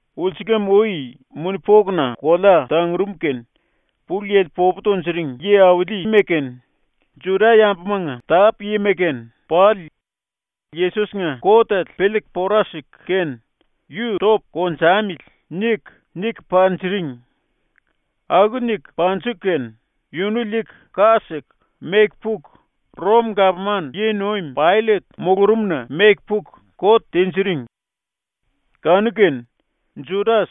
Ulsulam-ui muni-pokuna kolea tangurum kene Pulu Yili popu tunjuring yi-aulima kene, Juda-yambumanga tápu-yima kene pali ⸤Yesos-nga kotele piliiku pora siku kene⸥ ‘Yu topu konjamili.’ niku, niku panjiring. Aku niku panjiku kene yunu liiku, ka siku, meku puku, ⸤Rom-⸥gapman yi-nuim Paillet mulurumna meku puku kot tinjiring. Kanu-kene Judas,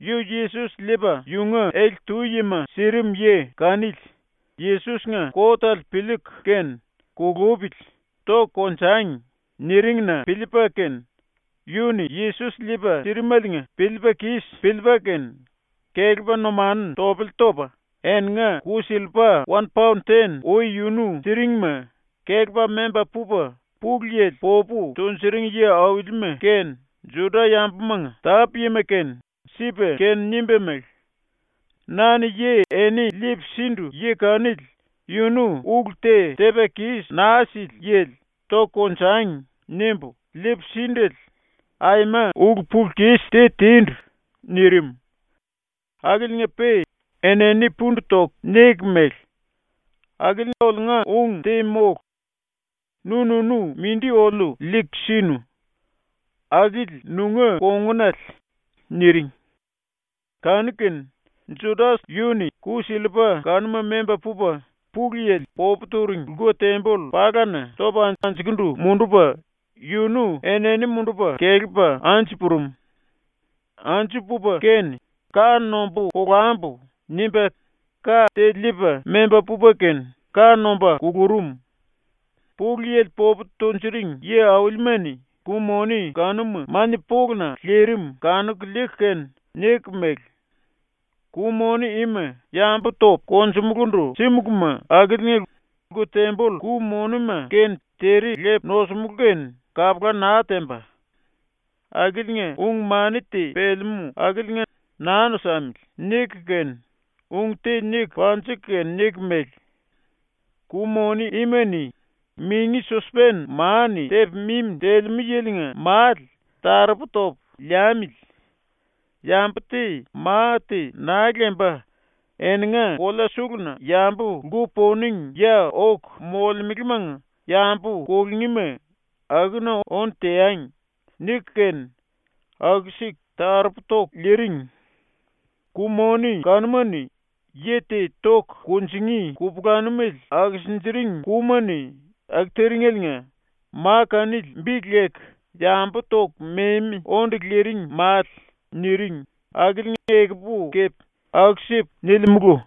yu Yesos liipa yunga ele-túma sirim yi kanili, Yesos-nga kotele piliiku kene “Kulupili, toku konjangi.” niring-na piliipa kene yu-ni Yesos liipa sirimeliinga piliipa kis piliipa kene kelepa numanu topele topa eninga ku-sillipa wan paon ten ui yunu siringma kelepa memba pupa Pulu Yili popu tunjuring yi-aulima kene Juda-yambumanga tápu-yima kene sipa kene nimba mele: “Na-ni yi eni liipu sindu yi kanili yunu ulu te tepa kis naa sili yili ‘Toku konjangi.’ nimbu liipu síndele aima ulu-pulu-kis te tindu.” nirim. Akiliinga-pe enini pundu toku niku mele: “Akili oliunga ung te mólu. ⸤Nu-nunu mindi oliu liiku sinu.⸥ Akili nunga kongunale.” niring. Kanu-kene Judas yu-ni ku-sillipa kanuma memba pupa ⸤Pulu Yili popu turing⸥ lku-temboll palana topa anjukundu mundupa yunu enini mundupa kelepa anju purum. Anju pupa kene ‘Ka nombu kolambu.’ nimba ka te liipa memba pupa kene ka nomba kulurum. Pulu Yili popu tunjuring yi-aulima-ni ku-moni kanuma ⸤mania-poluna⸥ lirim kanuku liiku kene niku mele: “Ku-moni ima yambu topu konjumulundu símuluma akiliinga lku-temboll ku-monima kene tere lepu nosimulú kene kapula naa temba. Akiliinga ung-mani te pelemú akiliinga naa nosamili.” niku kene ung te niku panjiku kene niku mele: “Ku-moni ima-ni mingi-sospen ma-ni tepa mimi telemú yilinga male taropu topu liamili. Yambu te ma te naa lemba eninga kolea suluna yambu lku-poning ya oku molemelemanga yambu kulungíma akuna ónu teangi.” niku kene aku-siku taropu toku liiring. ⸤Ku-moni kanuma-ni yi te toku kunjingí kupulanumele akisinjiring kúma-ni⸥ aku tiringeliinga ma kanili bi leku ‘Yambu Toku Memi Onde Liring Male’ niring akili ekupu kepe aku-sipu nilimulu.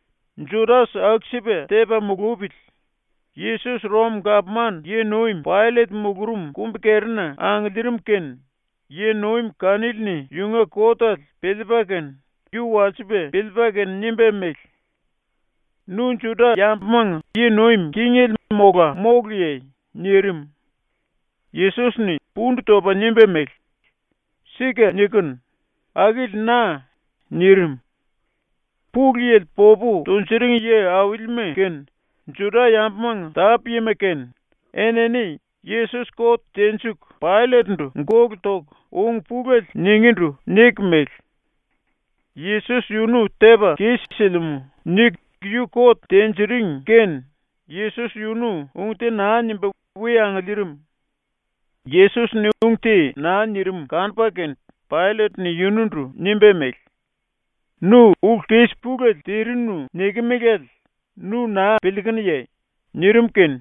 Judas aku-sipa tepa mulupili Yesos Rom-gapman yi-nuim ⸤Paillet⸥ mulurum kumbi-kerina angiliirim kene yi-nuim kanili-ni ⸤yunga kotele piliipa kene⸥ yu walsipa piliipa kene nimba mele: “Nu Juda-yambumanga yi nuim kingele mola móluye?” nirim. Yesos-ni pundu topa nimba mele: “Sika nikinu. Akili na.” nirim. Pulu Yili popu tunjuring yi-aulima kene, ⸤Juda-yambumanga⸥ tápu-yima kene, enini Yesos kot tenjiku Paillet-ndu ⸤gólu toku⸥ ung pulele ningindu niku mele: “Yesos yunu tepa kis-silimú.” niku yu kot tinjiring kene Yesos yunu ung te naa nimba we angiliirim. ⸤Yesos-ni ung te naa nirim kanupa kene⸥ Paillet-ni yunundu nimba mele: “Nu ulu-kis pulele tirinu nikimelale nu naa piliikunuye?” nirim kene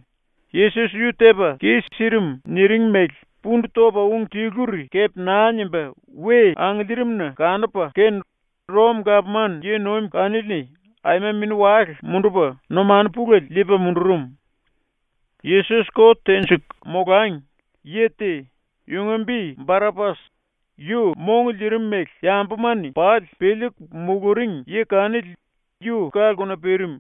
Yesos ⸤yu tepa kis-sirim niring mele⸥ pundu topa ung tiluri kepe naa nimba ⸤we angiliirim-na kanupa kene Rom-⸥ gapman yi-nuim kanili-ni aima mini-wale mundupa numanu pulele liipa mundurum. ⸤Yesos kot tenjiku molangi,⸥ yi te, yunga bi Barapas, yu mong liirim mele yambuma-ni pali piliiku muluring yi kanili yu ka-lkuna pirim.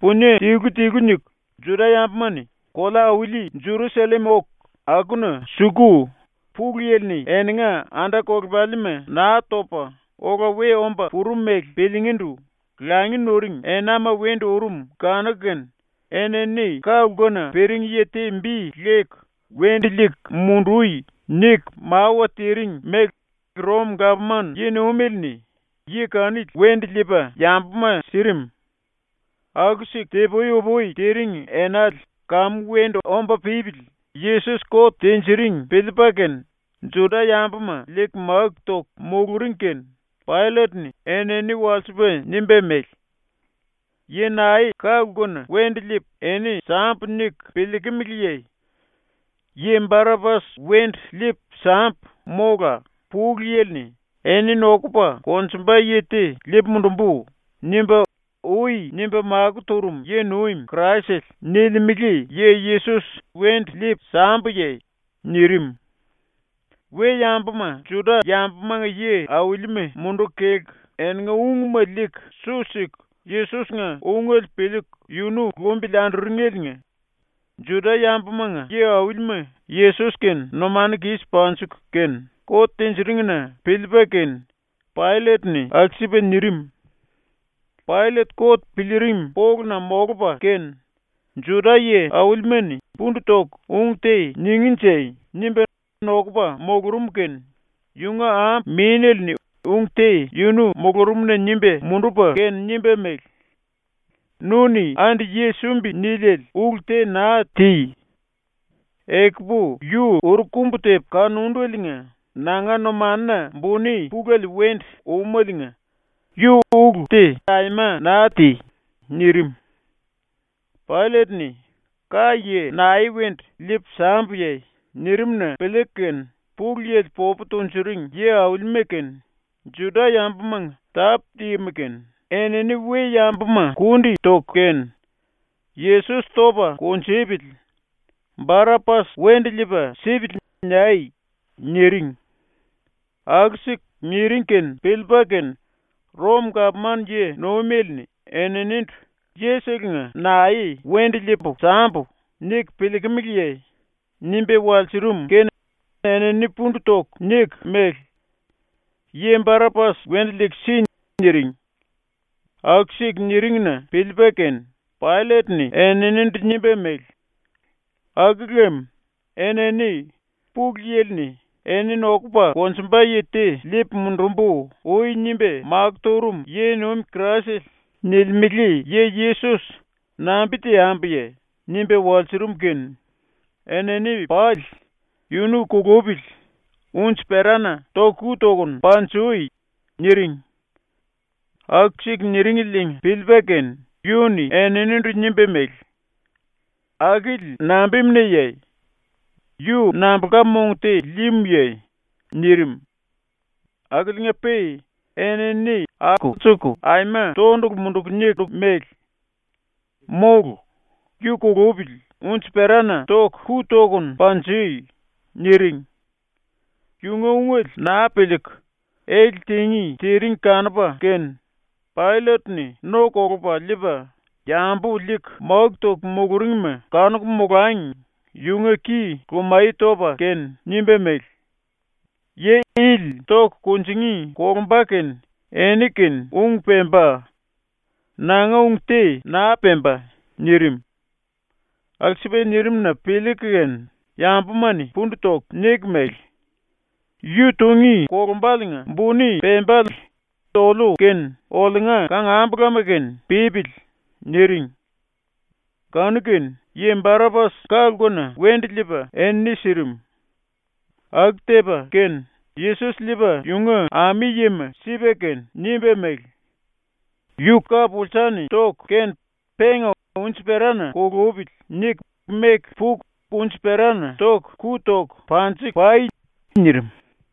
⸤Punie tilu-tilu niku, Juda-yambuma-ni kolea-auli Jerusallem oku akuna suku⸥ Pulu Yili-ni eninga anda-kolepalima Naa Topa Ola We Omba Purum mele piliingíndu langi nuring enama wendu urum kanu-kene enini ka-lkuna pirim yi te bi leku “Wendu liiku mundui.” niku mawa tiring mele ⸤Rom-⸥gapman yi-nuimele-ni yi kanili wendu liipa yambuma sirim. ⸤Aku-siku ti-pui-upui tiring enale kamu wendu omba pípili Yesos kot tinjiring piliipa kene,⸥ Juda-yambuma liiku máku toku muluring kene Paillet-ni enini walsipa nimba mele: “Yi nae ka-lkuna wendu liipu eni sambu niku piliikimiliye? Yi Barapas wendu liipu sambu, mola “Pulu Yili-ni “Eni nokupa konjumba yi te liipu mundumbu.” nimba ui nimba makó turum yi-nuim Kraisele.” nilimele yi Yesos wendu liipu sambuye?” nirim. ⸤We-yambuma Juda-yambumanga yi-aulima munduku kelku eninga ungma liiku su siku Yesos-nga ungele piliiku yunu lumbili anduringeliinga Juda-yambumanga yi-aulima⸥ Yesos-kene numanu kis panjiku kene kot tinjiring-na piliipa kene Paillet-ni aku-sipa nirim. Paillet kot piliirim poluna ⸤molupa kene ‘Juda-yi aulima-ni pundu toku ung te ningínje.’ nimba nokupa⸥ mulurum kene yunga ambu-mínele-ni ung te yunu mulurumna nimba mundupa kene nimba mele: “Nu-ni andi yi sumbi niliele ulu te naa ti. Ekupu yu uru-kumbu tepu kanundeliinga nanga numanuna buni pulele wendu úmeliinga yu ulu te aima naa ti.” nirim. ⸤Paillet-ni “Ka-yi nae wendu liipu sambuye?” nirim-na piliiku kene⸥ Pulu Yili popu tunjuring yi-aulima kene, ⸤Juda-yambumanga⸥ tápu-yima kene, enini we-yambuma kundi toku kene “ “Yesos topa kunjupili. Barapas wendu liipa sipili.” niai.” niring. ⸤Aku-siku niring kene piliipa kene Rom-⸥gapman yi-nuimele-ni eninindu “Yiselenga ‘nae wendu liipu sambu.’ niku piliikimiliye?” nimba walsurum kene enini pundu toku niku mele: “Yi Barapas ⸤wendu liiku si⸥.” niring. Aku-siku niring-na piliipa kene Paillet-ni eninindu nimba mele: “Aku lem, enini “Pulu Yili-ni “Eni nokupa konjumba yi te liipu mundumbu.” ui nimba makó turum yi-nuim Kraisele.” nilimele yi Yesos, nambi teambuye?” nimba walsurum kene enini pali “Yunu kulupili, unji-perana ⸤toku⸥ ku tokunu panjui!” niring. Aku-siku niringeliinga piliipa kene yu-ni eninindu nimba mele: “Akili nambimunaye? Yu nambulka mong te líímuye?” nirim. Akiliinga-pe enini ⸤alsuku⸥ aima tondulu munduku niku mele: “Mólu! Yu kulupili, unji-perana ⸤toku⸥ ku tokunu panjui!” niring. Yunga ungele naa piliiku, ele tingí tiring kanupa kene Paillet-ni no kolupa liipa, yambu liiku máku toku muluringma kanuku molangi yunga ki lumaye topa kene nimba mele: “Yi ili toku kunjingí kolumba kene eni-kene ung pemba; nanga ung te naa pemba.” nirim. ⸤Aku-sipa nirim-na piliiku kene⸥ yambuma-ni pundu toku niku mele: “Yu tungí kolumbaliinga buni pembale oliu kene oliunga kangambulama kene pípili.” niring. Kanu-kene yi Barapas ka-lkuna wendu liipa enini sirim. ⸤Aku tepa kene⸥ Yesos liipa ⸤yunga ami-yima⸥ sipa kene nimba mele: “Yu ka-pulsa-ni toku kene penga ‘Unji-perana kulupili.’ niku meku puku unji-perana ⸤toku⸥ ku toku panji-pai.” nirim.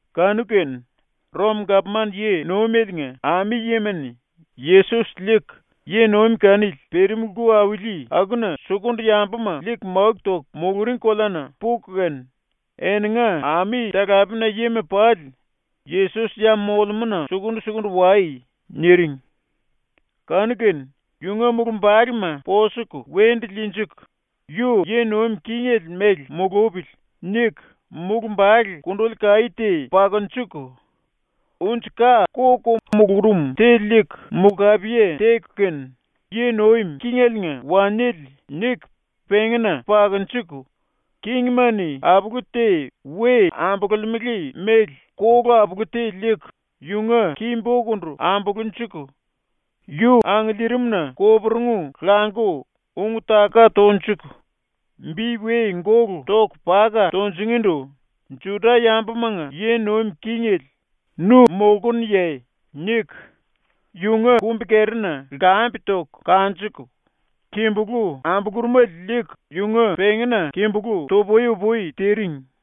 Kanu-kene ⸤Rom-⸥ gapman yi-nuimeliinga ami-yima-ni Yesos liiku yi-nuim kanili pirim lku auli akuna sukundu ⸤yambuma liiku máku toku muluring koleana⸥ puku kene, eninga ami-talapena-yima pali “⸤Yesos ya molemúna⸥ sukundu-sukundu wai.” niring. Kanu-kene yunga mulumbalema posuku wendu liinjiku, ‘Yu yi nuim kingele mele mulupili.’ niku mulumbale kunduli kaí te pakunjuku, unji-ka ko-ko mulurum te liiku mulkapiye teku kene ‘Yi nuim kingeliinga waniele.’ niku pengína pakunjuku, kingima-ni apulu te we ambululimele mele kolu-apulu te liiku yunga ki-bokundu ambulunjuku, yu angiliirimna koporungu languku ung-taka tonjuku bi we gólu toku paka tunjingindu “Juda-yambumanga yi nuim kingele, nu molkunuye?” niku yunga kumbi-kerina lkambe toku kanjuku, kimbulú ambulurumele liiku yunga pengína kimbulú tu-pui-upui tiring.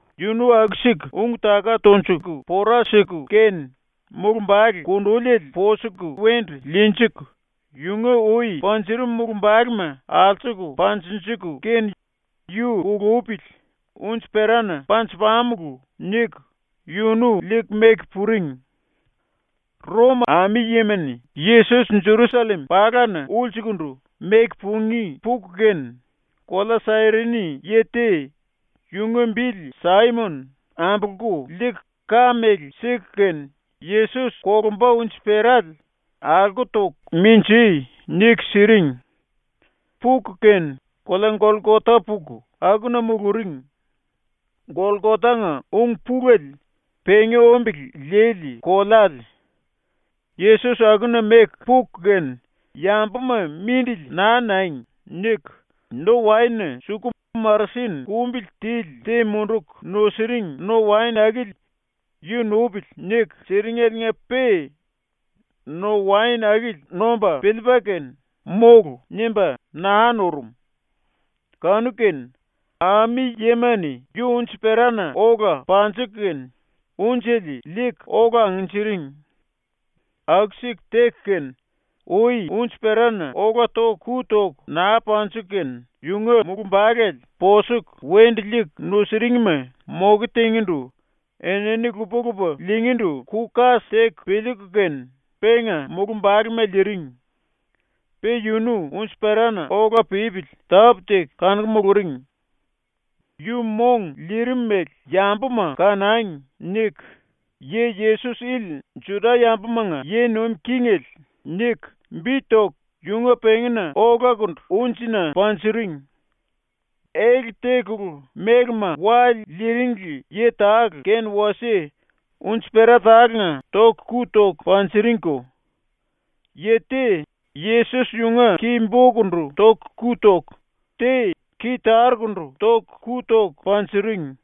Yunu aku-siku ung-taka tonjuku pora siku kene mulumbale kunduliele posuku wendu liinjiku, yunga ui panjurum mulumbalema alsuku panjinjiku kene “Yu kulupili, unji-perana panju-pamulu.” niku yunu liiku meku puring. ⸤Rom ami-yima-ni Yesos Jerusallem palana⸥ ulsukundu meku pungí puku kene, kolea Sairini yi te, yunga bili Saimon, ambolku liiku ka mele siku kene Yesos kolumba unji-perale “Alko toku minjí.” niku siring. Puku kene kolea Golkota puku akuna muluring. (Golkotanga ung-pulele ‘pengi-ombele lili koleale’.) ⸤Yesos akuna meku puku kene, ‘Yambuma mindili naa nangi.’ niku⸥ no-waen-na suku marasin kumbili tili te munduku nusiring no-waen akili ‘Yu nupili.’ niku, siringeliinga-pe no-waen akili nomba piliipa kene “Mólu.” nimba naa nurum. Kanu-kene ⸤ami-yima-ni⸥ yu unji-perana ola panjiku kene unjele liiku ola angnjiring. ⸤Aku-siku teku kene, ui unji-perana ola ⸤toku⸥ ku toku naa panjiku kene⸥ yunga mulumbale ⸤posuku wendu liiku nusuringma⸥ moke tingindu enini lupa-lupa liingíndu ku-kas teku piliiku kene penga mulumbalema liiring. Pe yunu unji-perana ola pípili tápu-teku kanuku muluring. ‘Yu mong liirim mele yambuma kanangi.’ niku YI-YESOS ILI JUDA-YAMBUMANGA YI NUIM KINGELE niku bi toku yunga pengína olakundu unjina panjiring. Ele tekulu mélema wa liiringli yi tale kene wasie unji-pera tálenga ⸤toku⸥ ku toku panjiringko. Te Yesos yunga ki-bokundu ⸤toku⸥ ku toku, te ki-tarukundu ⸤toku⸥ ku toku panjiring.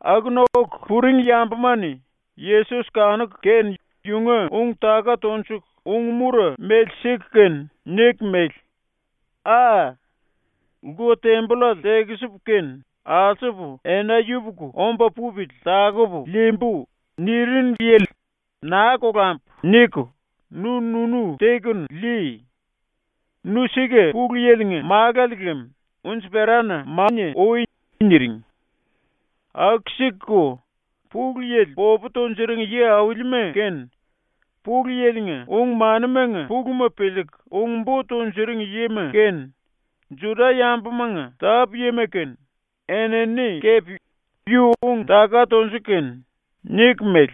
Akuna oku puring yambuma-ni Yesos ⸤kanuku kene yunga⸥ ung-taka tonjuku ung-mura mele siku kene niku mele: “Aa! “Lku-tembollale tekisipu kene alsupu ena yupuku omba pupili takupu liimbu.” nirinu yili, ‘Naa kolambu.’ niku nu-nunu tekunu lii. Nu sika Pulu Yili-nga Málale lem unji-perana mania ui.” niring. Aku-sikuko Pulu Yili popu tunjuring yi-aulima kene, Pulu Yili-nga ung-manimanga puluma piliiku ung-bo tunjuring yima kene, ⸤Juda-yambumanga⸥ tápu-yima kene, enini kepe yu ung-taka tonjuku kene niku mele: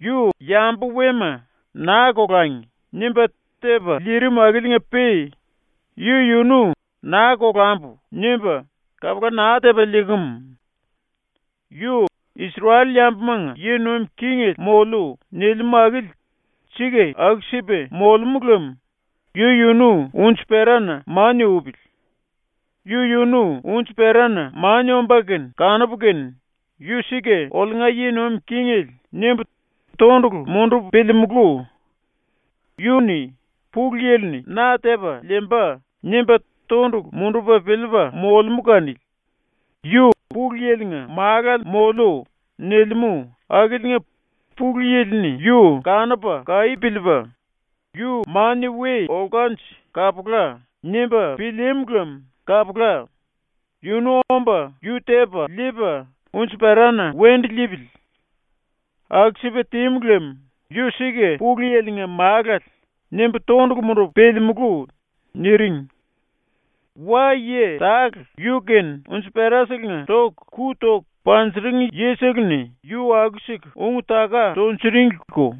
“Yu yambu-wema ‘Naa kolangi.’ nimba tepa liirim akiliinga-pe yu-yunu ‘Naa kolambu.’ nimba kapula naa tepa liikimu. Yu ‘Isrel-yambumanga yi nuim kingele ⸤moliu.’ nilimú akili sika aku-sipa⸥ molemú lem yu-yunu unji-perana mania upili. Yu-yunu unji-perana mania ombá kene kanupu kene ‘Yu sika oliunga yi nuim kingele.’ nimbu tondulu mundupu piliimulú. Yu-ni ‘Pulu Yili-ni na tepa liimba.’ nimba tondulu mundupa piliipa molemú kanili; yu “Pulu Yili-nga Málale moliu.” nilimú akiliinga Pulu Yili-ni yu kanupa kaí piliipa, ‘Yu mania we olkanje kapula.’ nimba pilíímu lem kapula, yunu omba yu tepa liipa ⸤unji-perana wendu liipili⸥. ⸤Aku-sipa tímu lem ‘Yu sika Pulu Yili-nga Málale.’ nimbu tondulu mundupu piliimulú⸥.” niring. Wa-yi tale yu-kene unji-peraselenga ⸤toku⸥ ku toku panjiring yisele-ni yu aku-siku ung-taka tunjuringliko.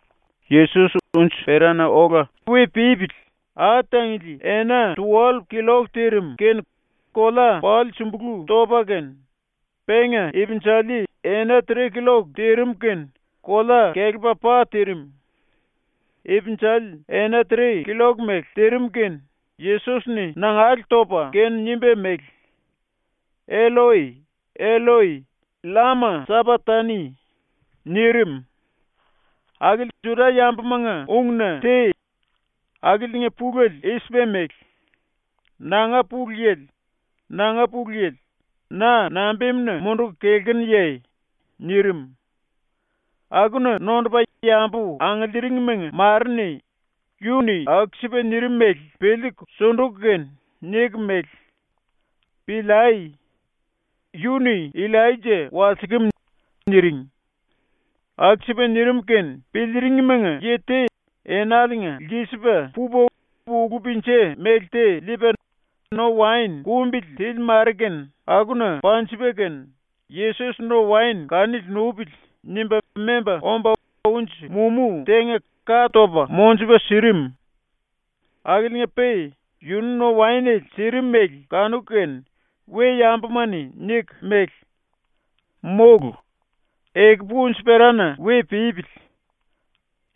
⸤Yesos unji-perana ola we pípili⸥ ai-tangili ena tuwallup killok tirim kene kolea pali sumbulú topa kene, penga ipinjali ena tre killok tirim kene kolea kelepa pa tirim. Ipinjali ena tre killok mele tirim kene Yesos-ni nangale topa kene nimba mele: “Elloi, Elloi, llama sapaktani.” nirim. Akili Juda-yambumanga ungna te. Akiliinga pulele i-sipa mele: “Nanga Pulu Yili, nanga Pulu Yili, na nambimuna munduku kelkunuye?” nirim. Akuna nondupa yambu angiliiringmanga mare-ni yu-ni aku-sipa nirim mele piliiku ⸤sunduku kene⸥ niku mele: “Piliai. Yu-ni Illaija walsikim.” niring. Aku-sipa nirim kene piliiringmanga yi te enaliinga lkisipa pupa ulu-pinja mele te liipa no-waen kumbili tili mare kene akuna panjipa kene, ‘Yesos no-waen kanili nupili.’ nimba memba omba unji-mumú tenga ka topa monjupa sirim. ⸤Akiliinga-pe yunu no-waenele sirim mele kanuku kene⸥ we-yambuma-ni niku mele: “Mólu. Ekupu unji-perana we pípili.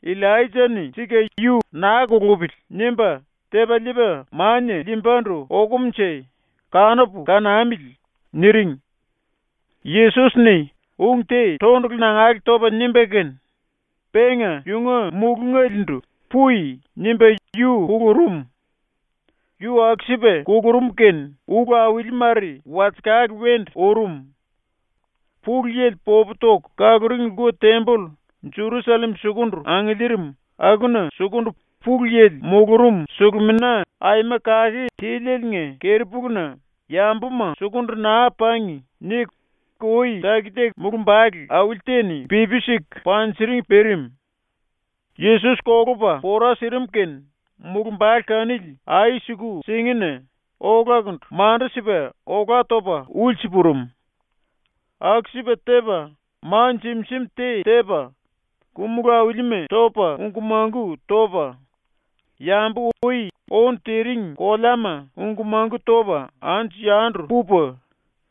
Illaija-ni sika yu ‘Naa kulupili.’ nimba tepa liipa mania liimbandu okumunje, kanupu kanamili.” niring. Yesos-ni ung te tondulu nangale topa nimba kene, penga yunga mulungale-ndu ‘Pui.’ nimba yu kulurum. Yu aku-sipa kulurum kene ⸤ulu-auli mare⸥ walsekale ⸤wendu urum.⸥ Pulu Yili popu toku kaluring lku-temboll ⸤Jerusallem sukundu angiliirim akuna sukundu Pulu Yili mulurum⸥ Sulumina Aima Kake Tilieliinga keri-puluna ⸤‘Yambuma sukundu naa pangi.’ niku ui taki-taki⸥ mulumbale auli te-ni pipi siku panjiring pirim. ⸤Yesos kolupa pora sirim kene⸥ mulumbale kanili ai-suku-singina olakundu mandu-sipa olá topa ulsu purum. ⸤Aku-sipa tepa,⸥ ma jim-jim te tepa, ku-mulú aulima topa ungku-mangku topa, yambu ui ónu tiring koleama ungku-mangku topa anju-yandu pupa,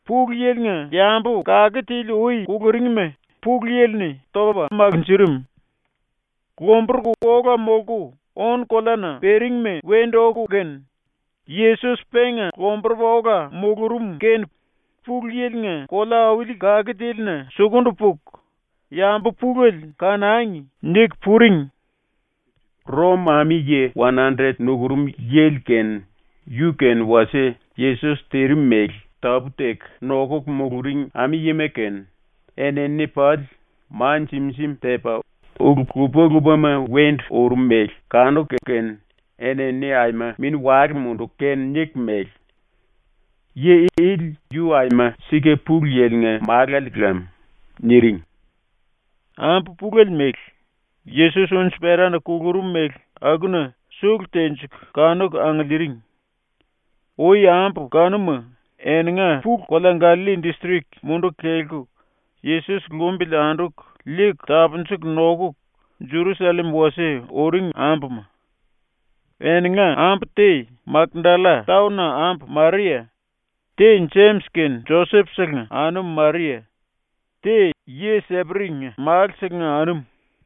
Pulu Yili-nga yambu kake tili ui kuluringima ⸤Pulu Yili-ni⸥ topa makinjirim. Lomburuku ola molku ónu-koleana piringma wendu oku kene, Yesos penga lomburupa ola mulurum kene Pulu Yili-nga kolea-auli kake tílina sukundu puku yambu pulele ‘Kanangi.’ niku puring. ⸤Rom⸥ ami-yi wan-andret nukurum yili kene, yu-kene wasie Yesos tirim mele tápu-teku nokuku muluring ami-yima kene, enini pali ma jim-jim tepa ulu lupa-lupama wendu urum mele kanuku kene enini aima mini-wale munduku kene niku mele: “Yi ili yu aima sika Pulu Yili-nga Málale lam.” niring. Ambu pulele mele, ⸤Yesos unji-perana kulurum mele⸥ akuna sulu-tenjiku kanuku angiliiring. Ui ambu kanuma ⸤eninga pulu-⸥kolea Gallalli distrik munduku kelku Yesos lumbili anduku liiku tapunjuku nokuku ⸤Jerusallem wasie⸥ uring ambuma. Eninga ambu te Makdalla-taon-na ambu Maria, te Jemis kene Joses-selenga anum Maria, te yi Seperi-nga málu-selenga anum.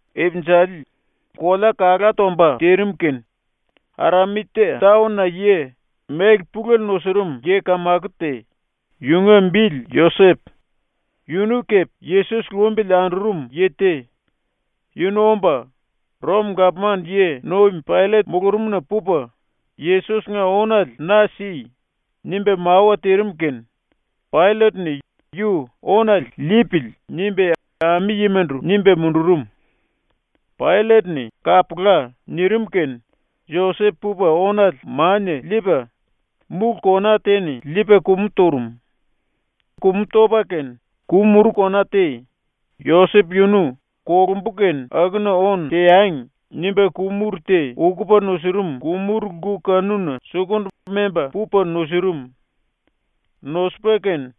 Ipinjali, kolea kalá tomba tirim kene Arimatia taon-na yi, méle pulele nusurum yi-kamako te, yunga bili Josep, yunu kepe Yesos lumbili andurum yi te, yunu omba ⸤Rom-gapman yi-nuim⸥ Paillet mulurumna pupa, “Yesos-nga ónale na si.” nimba mawa tirim kene Paillet-ni yu “Ónale liipili.” nimba ⸤ami-yimandu nimba mundurum⸥. ⸤Paillet-ni “Kapula.” nirim kene⸥ Josep pupa ónale mania liipa, múlu kona te-ni liipa kumu turum. Kumu topa kene ku-muru kona te, Josep yunu ‘Kolumbu kene akuna ónu teangi.’ nimba ku-muru te ukupa nusurum ku-muru-lku kanuna sukundu memba pupa nusurum. Nosupa kene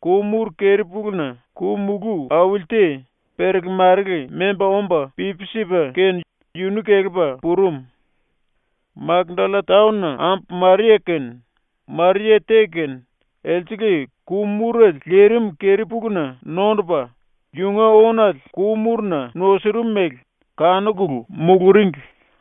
ku-muru keri-puluna ku-mulú auli te perele-marele memba omba pipi sipa kene yunu kelepa purum. Makdalla-taon-na ambu Maria kene Maria te kene elsele ku-murele lirim keri-puluna nondupa ⸤yunga ónale ku-muruna nusurum mele kanukulu⸥ muluringli.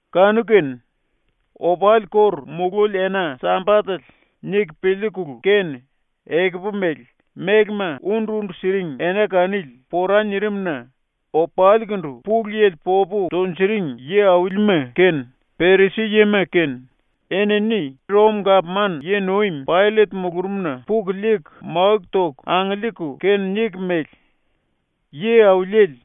⸤Kanu-kene,⸥ ‘Opali ⸤kóru mulúli ena-⸥ Sambatele.’ niku piliikulu kene, ekupu mele, mélema undu-undu siring ena kanili pora nirim-na opalikundu Pulu Yili popu tunjuring yi-aulima kene, Perisi-yima kene, enini ⸤Rom-gapman yi-nuim⸥ Paillet mulurumna puku liiku máku toku angiliiku kene niku mele: “Yi-Auliele,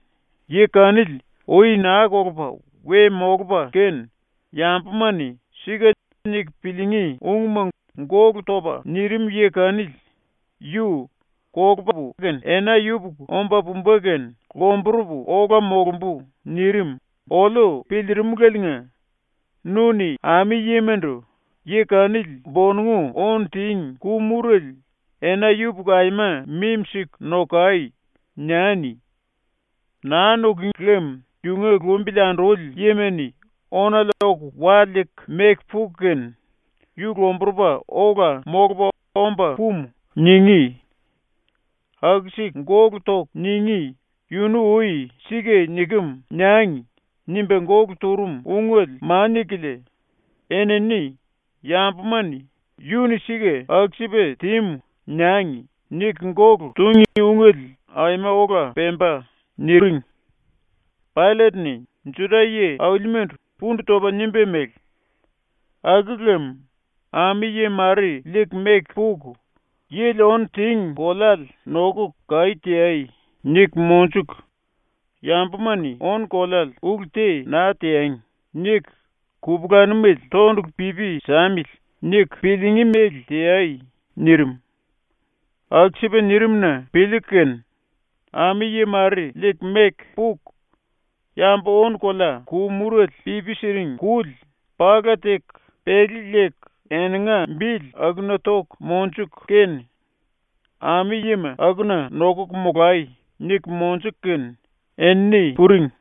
yi kanili ui naa kolupa we molupa kene yambuma-ni ‘Sika’ niku piliingí ungma gólu topa nirim yi kanili yu “Kolupu kene ena yupuku omba pumba kene lomburupu ola molumbu.” nirim oliu piliirimuleliinga ⸤nu-ni ami-yimandu⸥ “Yi kanili ⸤bonongu⸥ ónu tíngi ku-murele ena yupuku aima mimi-siku nokai!” niani. Naa nukúngi lem yunga lumbili anduli yima-ni ónale oku wa liiku meku puku kene “Yu lomburupa ola molupa omba pumu.” ningí. Aku-siku gólu toku ningí yunu ui ‘ ‘Sika nikem.’ niangi.’ nimba gólu turum ungele mania-kilia, enini ‘Yambuma-ni ‘Yu-ni sika aku-sipa tímu.’ niangi.’ niku gólu tungí ungele aima ola pemba.” niring. Paillet-ni ⸤Juda yi-aulimandu⸥ pundu topa nimba mele: “⸤Aku lem,⸥ ami-yi mare liiku meku puku, “Yili ónu tíngi koleale nokuku kaí teai.” niku monjuku, ‘Yambuma-ni ónu-koleale ulu te naa teangi.’ niku ‘Kupulanumele tondulu pipi samili.’ niku piliingí mele teai.” nirim. ⸤Aku-sipa nirim-na⸥ piliiku kene ami-yi mare liiku meku puku, yambu-ónu-kolea ku-murele pipi siring kuli pala teku pelé leku eninga bili akuna toku monjuku kene, “Ami-yima akuna nokuku molai.” niku monjuku kene ⸤enini puring⸥.